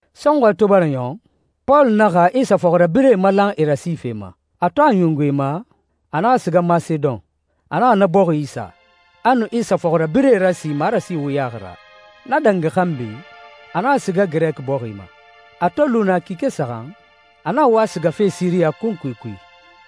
Sɔnxɔɛ to bara ɲɔn, Pɔlu naxa Isa fɔxirabirɛe malan e rasife ma. A to a ɲungu e ma, a naxa siga Masedon. A naxa na bɔxi isa, a nu Isa fɔxirabirɛe rasi marasi wuyaxi ra. Na dangi xanbi, a naxa siga Girɛki bɔxi ma. A to lu naa kike saxan, a naxa wa sigafe Siriya kunkui kui,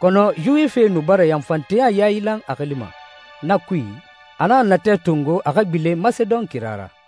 kɔnɔ Yuwifie nu bara yanfanteya yailan a xili ma. Na kui, a naxa natɛ tongo a xa gbilen Masedon kira ra.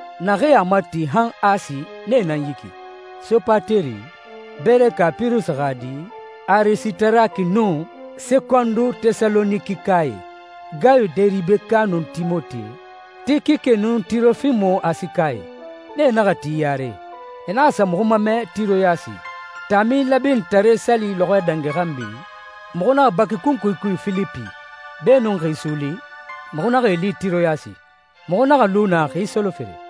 Naxee a mati han Asi nee nan yi ki: Sopateri, Beereka Pirusi xa di, Arisitaraki nun Sekondu Tɛsalonikikae, Gayu Deribeka nun Timote, Tikike nun Tirofimo Asikae. Nee naxa ti yare, e naxa sa muxu mamɛ Tiroyasi. Taami Lɛbinitare Sali lɔxɔɛ dangi xanbi, muxu naxa baki kunkui kui Filipi. Beenun xi suuli, muxu naxa e li Tiroyasi. Muxu naxa lu naa xi solofere.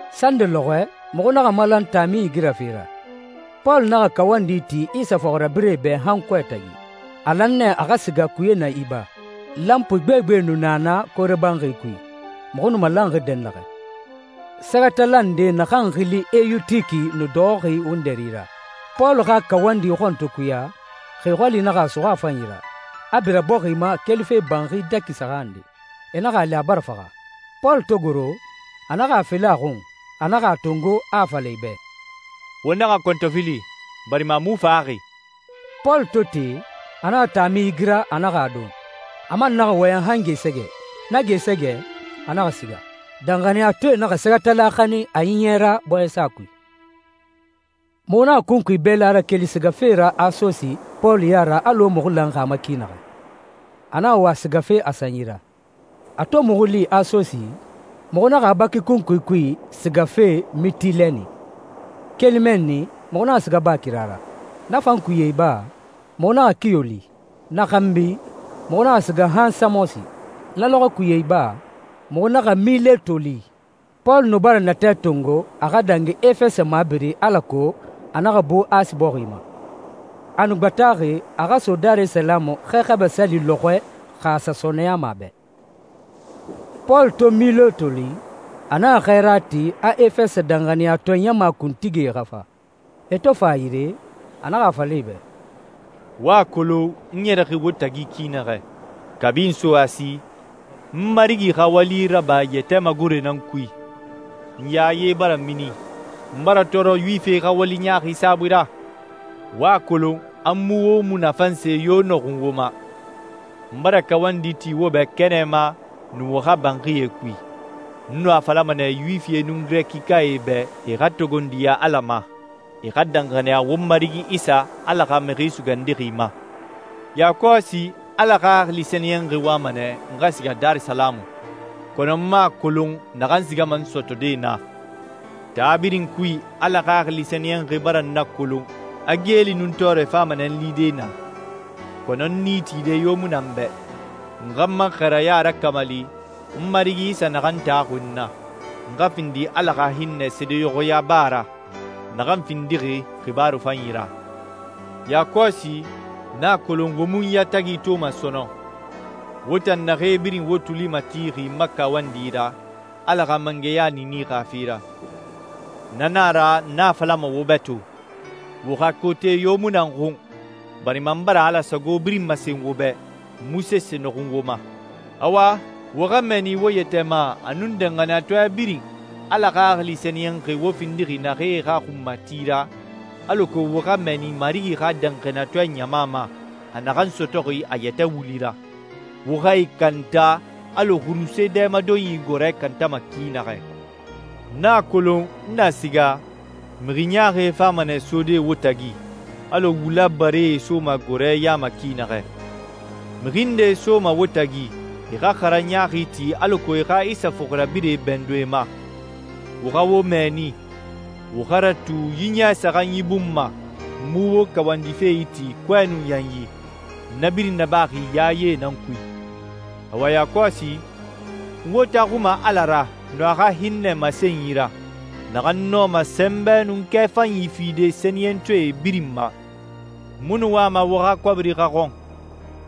Sande lɔxɔɛ muxu naxa malan taami igirafe ra. Pɔlu naxa kawandi ti Isa fɔxirabirɛe bɛ han kɔɛ tagi. A lan nɛ a xa siga kuye na iba. Lanpui gbegbe nu na na koore banxi kui, muxu nu malanxi dɛnnaxɛ. Sɛgɛtala nde naxan xili Eyutiki nu dɔxɔxi wundɛri ra. Pɔlu xa kawandi xɔn to kuya, xi xɔli naxa a suxu a fanyi ra, a bira bɔxi ma kelife banxi dɛki saxan nde. E naxa a li, a bara faxa. Pɔlu to goro, a naxa a felen a xun. A naxa a tongo, a a fala e bɛ, «Wo naxa kɔntɔfili, barima a mu faxaxi.» Pɔlu to te, a naxa taami igira, a naxa a don. A man naxa wɔyɛn han gɛɛsɛgɛ. Na gɛɛsɛgɛ, a naxa siga. Danxaniyatɔɛe naxa sɛgɛtala xanin a ɲiɲɛ ra bɔɲɛsa kui. Muxu naxa kunkui bɛla rakeli sigafe ra Asosi Pɔlu ya ra alɔ muxu lanxi a ma ki naxɛ. A naxa wa sigafe a sanyi ra. A to muxu li Asosi, muxu naxa a baki kunkui kui sigafe Mitilɛni. Keli mɛnni, muxu naxa siga baa kira ra. Na fan kuye iba, muxu naxa Kiyo li. Na xanbi, muxu naxa siga han Samosi. Na lɔxɔɛ kuye iba, muxu naxa Mileto li. Pɔlu nu bara natɛ tongo a xa dangi Efɛsɛ mabiri alako a naxa bu Asi bɔxi ma. A nu gbataxi a xa so Darisalamu Xɛ Xabɛ Sali lɔxɔɛ xa a sa sɔɔnɛyama a bɛ. Pɔlu to Mileto li, a naxa xɛɛra ti a Efɛsɛ danxaniyatɔɛ ɲama kuntigie xa fa. E to fa a yire, a naxa a fala e bɛ, «Wo a kolon n ɲɛrɛxi wo tagi ki naxɛ. Kabi n so Asi, n Marigi xa wali raba yɛtɛ magoroe nan kui. N yaye bara mini, n bara tɔɔrɔ Yuwifie xa wali ɲaaxi saabui ra. Wo a kolon a n mu wo munafan se yo nɔxun wo ma. N bara kawandi ti wo bɛ kɛnɛ ma nun wo xa banxie kui. N nu a falama nɛ Yuwifie nun Girɛkikae bɛ e xa togondiya Ala ma, e xa danxaniya won Marigi Isa, Ala xa Mixi Sugandixi ma.» «Yakɔsi Ala Xaxili Sɛniyɛnxi wama nɛ n xa siga Darisalamu, kɔnɔ n mu a kolon naxan sigama n sɔtɔde naa. Taa birin kui Ala Xaxili Sɛniyɛnxi bara n nakolon a geeli nun tɔɔrɛ fama nɛ n lide naa. Kɔnɔ n nii tide yo mu na n bɛ. N xa n ma xɛɛraya rakamali, n Marigi Isa naxan taxuxi n na. N xa findi Ala xa hinnɛ seedeɲɔxɔya ba ra, naxan findixi xibaaru fanyi ra.» «Yakɔsi n a kolon wo mu n yatagi toma sɔnɔn, wo tan naxee birin wo tuli matixi n ma kawandi ra, Ala xa mangɛya niini xa fe ra. Na na a ra, n a falama wo bɛ to, wo xa kote yo mu na n xun, barima n bara Ala sago birin masen wo bɛ, n mu sese nɔxun wo ma. Awa, wo xa mɛɛni wo yɛtɛ ma a nun danxaniyatɔɛ birin, Ala Xaxili Sɛniyɛnxi wo findixi naxee xa xunmati ra, alako wo xa mɛɛni Marigi xa danxaniyatɔɛ ɲama ma, a naxan sɔtɔxi a yɛtɛ wuli ra. Wo xa e kanta alɔ xurusee dɛmadonyi gɔɔrɛ kantama ki naxɛ. N na kolon, n na siga, mixi ɲaaxie fama nɛ sode wo tagi, alɔ wula baree soma gɔɔrɛ ya ma ki naxɛ. Mixi ndee soma wo tagi, e xa xaranyi ɲaaxi ti alako e xa Isa fɔxirabirɛe bɛndun e ma. Wo xa wo mɛɛni. Wo xa ratu yi ɲɛ saxanyi bun ma n mu wo kawandife iti kɔɛ nun yanyi. N na birin nabaxi yaye nan kui.» «Awa yakɔsi, n wo taxuma Ala ra nun a xa hinnɛ masenyi ra, naxan nɔma sɛnbɛ nun kɛ fanyi fide sɛniyɛntɔɛ birin ma. N mu nu wama wo xa kɔbiri xa xɔn,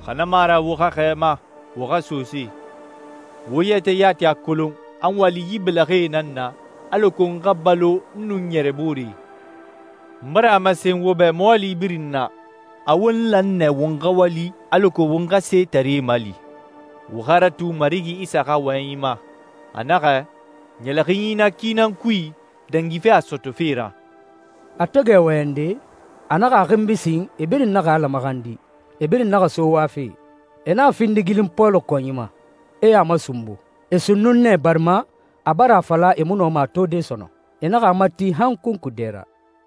xa na mu a ra wo xa xɛɛma, wo xa sosee. Wo yɛtɛ yati a kolon a n wali yi bɛlɛxɛe nan na alako n xa balo n nun n ɲɛrɛbooree. N bara a masen wo bɛ mɔɔli birin na, a won lan nɛ won xa wali alako won xa setaree mali. Wo xa ratu Marigi Isa xa wɔyɛnyi ma, a naxɛ, ‹Ɲɛlɛxinyi na ki nan kui, dangife a sɔtɔfe ra.›» A to gɛ wɔyɛnde, a naxa a xinbi sin, e birin naxa Ala maxandi. E birin naxa so wafe. E naxa findigilin Pɔlu kɔnyi ma, e a masunbu. E sunnun nɛ barima a bara a fala e mu nɔma a tode sɔnɔn. E naxa a mati han kunkui dɛ ra.